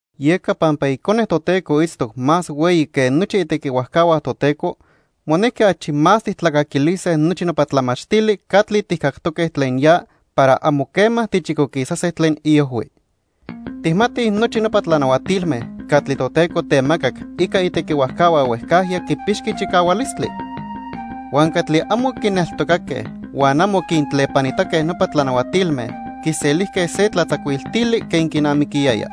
Yeca pampa Icone Toteco itztoc más hueyi que nochi itequihuajcahua Toteco, monequi achi más tijtlacaquilise nochi nopa tlamachtili catli tijcactoque tlen ya para amo quema tichicoquisase tlen iojhui. Tijmatij nochi nopa tlanahuatilme catli Toteco temacac ica itequihuajcahua huejcajya quipixqui chicahualistli. Huan catli amo quineltocaque huan amo quintlepanitaque nopa tlanahuatilme, quiselijque se tlatzacuiltili quen quinamiquiyaya.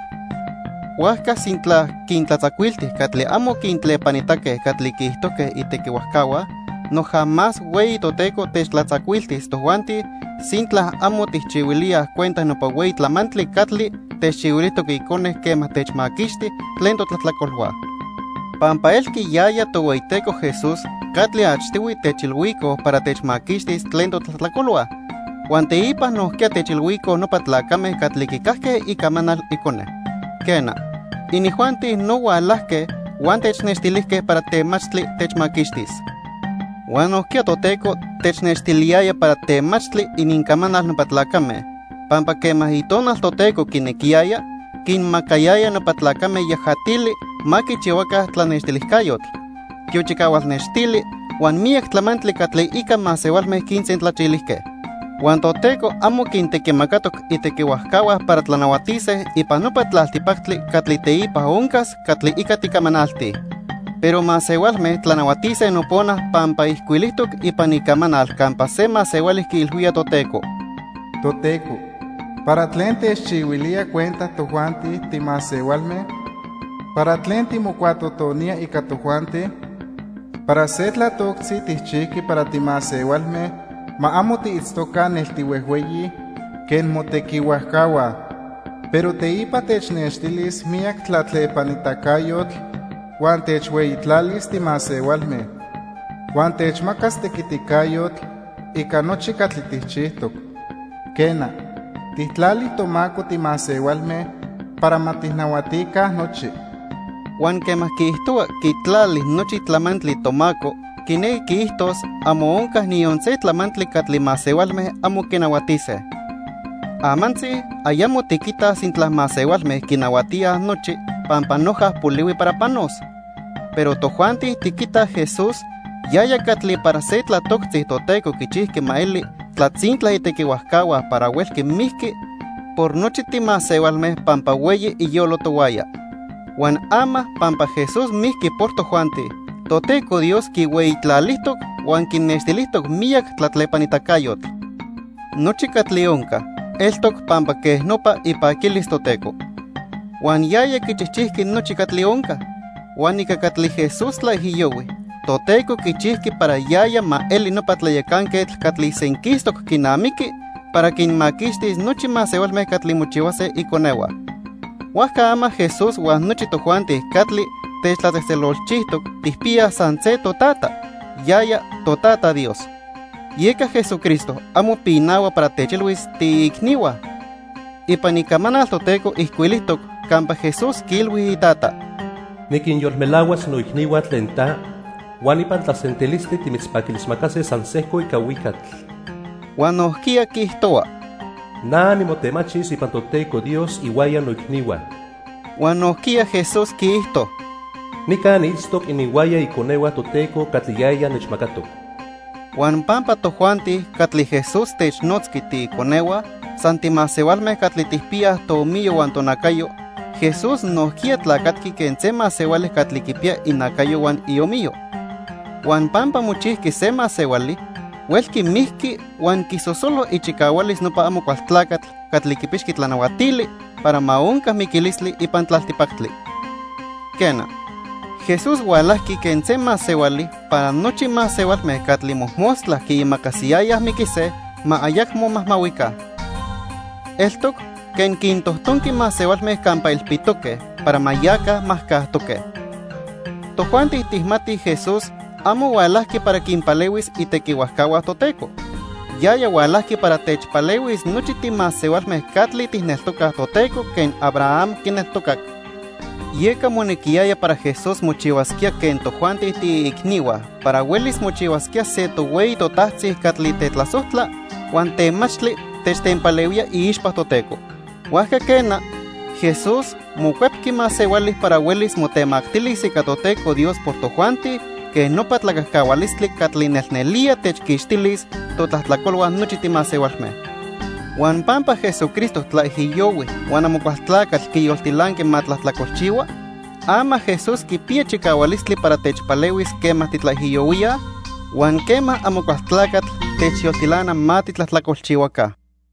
Huajca sintla quintlatzacuilti catli amo quintlepanitaque catli quiijtojque itequihuajcahua, noja más hueyi Toteco techtlatzacuiltis tojuanti sintla amo tijchihuilíaj cuenta nopa hueyi tlamantli catli techchihuilijtoc Icone quema techmaquixti tlen totlajtlacolhua. Pampa elqui yaya Tohueyiteco Jesús catli achtihui techilhuicoj para techmaquixtis tlen totlajtlacolhua, huan teipa nojquiya techilhuicoj nopa tlacame catli quicajque icamanal Icone. Quena, inijuanti no hualajque huan technextilijque para temachtli techmaquixtis. Huan nojquiya Toteco technextiliyaya para temachtli inincamanal nopa tlacame, pampa quema Itonal Toteco quinequiyaya, quinmacayaya nopa tlacame yajatili ma quichihuaca tlanextilijcayotl, tiochicahual nextili huan miyac tlamantli catli ica masehualme quinsentlachilijque. Huan Toteco amo quintequimacatoc itequihuajcahua para tlanahuatise ipan nopa tlaltipactli catli teipa oncas catli ica ticamanaltij. Pero masehualme tlanahuatise nopona pampa ijcuilijtoc ipan Icamanal campa se masehuali quiilhuía Toteco: "Toteco, ¿para tlen techchihuilía cuenta tojuanti timasehualme? ¿Para tlen timocuatotonía ica tojuanti? Para se tlatoctzi tijchijqui para timasehualme ma amo tiitztoca nel tihuejhueyi quen motequihuajcahua. Pero teipa technextilis miyac tlatlepanitacayotl huan techhueyitlalis timasehualme. Huan techmacas tequiticayotl ica nochi catli tijchijtoc. Quena, tijtlali tomaco timasehualme para ma tijnahuatica nochi." Huan quema quiijtohua quitlali "nochi tlamantli" tomaco quinequi quiijtos amo onca niyon se tlamantli catli masehualme amo quinahuatise. Amantzi ayamo tiquitaj sintla masehualme quinahuatíaj nochi pampa noja polihui para panos. Pero tojuanti tiquitaj Jesús, yaya catli para se tlatoctzi Toteco quichijqui ma eli tlatzintla itequihuajcahua para huelqui mijqui por nochi timasehualme pampa hueyi iyolo tohuaya. Huan ama pampa Jesús mijqui por tojuanti, Toteco Dios quihueyitlalijtoc huan quinextilijtoc miyac tlatlepanitacayotl. Nochi catli onca, eltoc pampa quej nopa ipaquilis Toteco. Huan yaya quichijchijqui nochi catli onca. Huan ica catli Jesús tlaijiyohui, Toteco quichijqui para yaya ma eli nopa tlayacanquetl catli senquistoc quinamiqui para quinmaquixtis nochi masehualme catli mochihuase iconehua. Huajca ama Jesús huan nochi tojuanti catli techtlatzejtzelolchijtoc tijpiyaj san se totata, yaya, toTata Dios. Yeca Jesucristo amo pinahua para techilhuis tiiicnihua. Ipan Icamanal Toteco ijcuilijtoc campa Jesús quiilhui iTata: "Niquinyolmelahuas noicnihua tlen ta, huan ipan tlasentilistli timitzpaquilismacase san sejco ica huicatl." Huan nojquiya quiijtohua: "Na nimotemachis ipan Toteco Dios ihuaya noicnihua." Huan nojquiya Jesús quiijto: "Nica niitztoc ininhuaya iconehua Toteco catli yaya nechmacatoc." Huan pampa tojuanti catli Jesús technotzqui "tiiconehua" san timasehualme catli tijpiyaj toomiyo huan tonacayo, Jesús nojquiya tlacatqui quen se masehuali catli quipiya inacayo huan iomiyo. Huan pampa mochijqui se masehuali, huelqui mijqui huan quisosolo ichicahualis nopa Amocualtlacatl catli quipixqui tlanahuatili para ma onca miquilistli ipan tlaltipactli. Quena, Jesús hualajqui quen se masehuali para nochi masehualme catli mojmostla quiimacasiyayaj miquise, ma ayacmo majmahuica. Eltoc quen quintojtonqui masehualme campa ilpitoque para ma yaca majcajtoque. Tojuanti tijmatij Jesús amo hualajqui para quinpalehuis itequihuajcahua Toteco. Yaya hualajqui para techpalehuis nochi timasehualme catli tijneltocaj Toteco quen Abraham quineltocac. Yeca monequiyaya para Jesús mochihuasquía quen tojuanti tiiicnihua para huelis mochihuasquía se tohueyi totajtzi catli tetlasojtla huan temachtli techtenpalehuía iixpa Toteco. Huajca quena, Jesús mocuepqui masehuali para huelis motemactilis ica Toteco Dios por tojuanti quen nopa tlacajcahualistli catli nelnelía techquixtilis totlajtlacolhua nochi timasehualme. Huan pampa Jesucristo tlaijiyohui huan Amocualtlacatl quiyoltilanqui ma tlajtlacolchihua, ama Jesús quipiya chicahualistli para techpalehuis quema titlaijiyohuíaj huan quema Amocualtlacatl techyoltilana ma titlajtlacolchihuaca.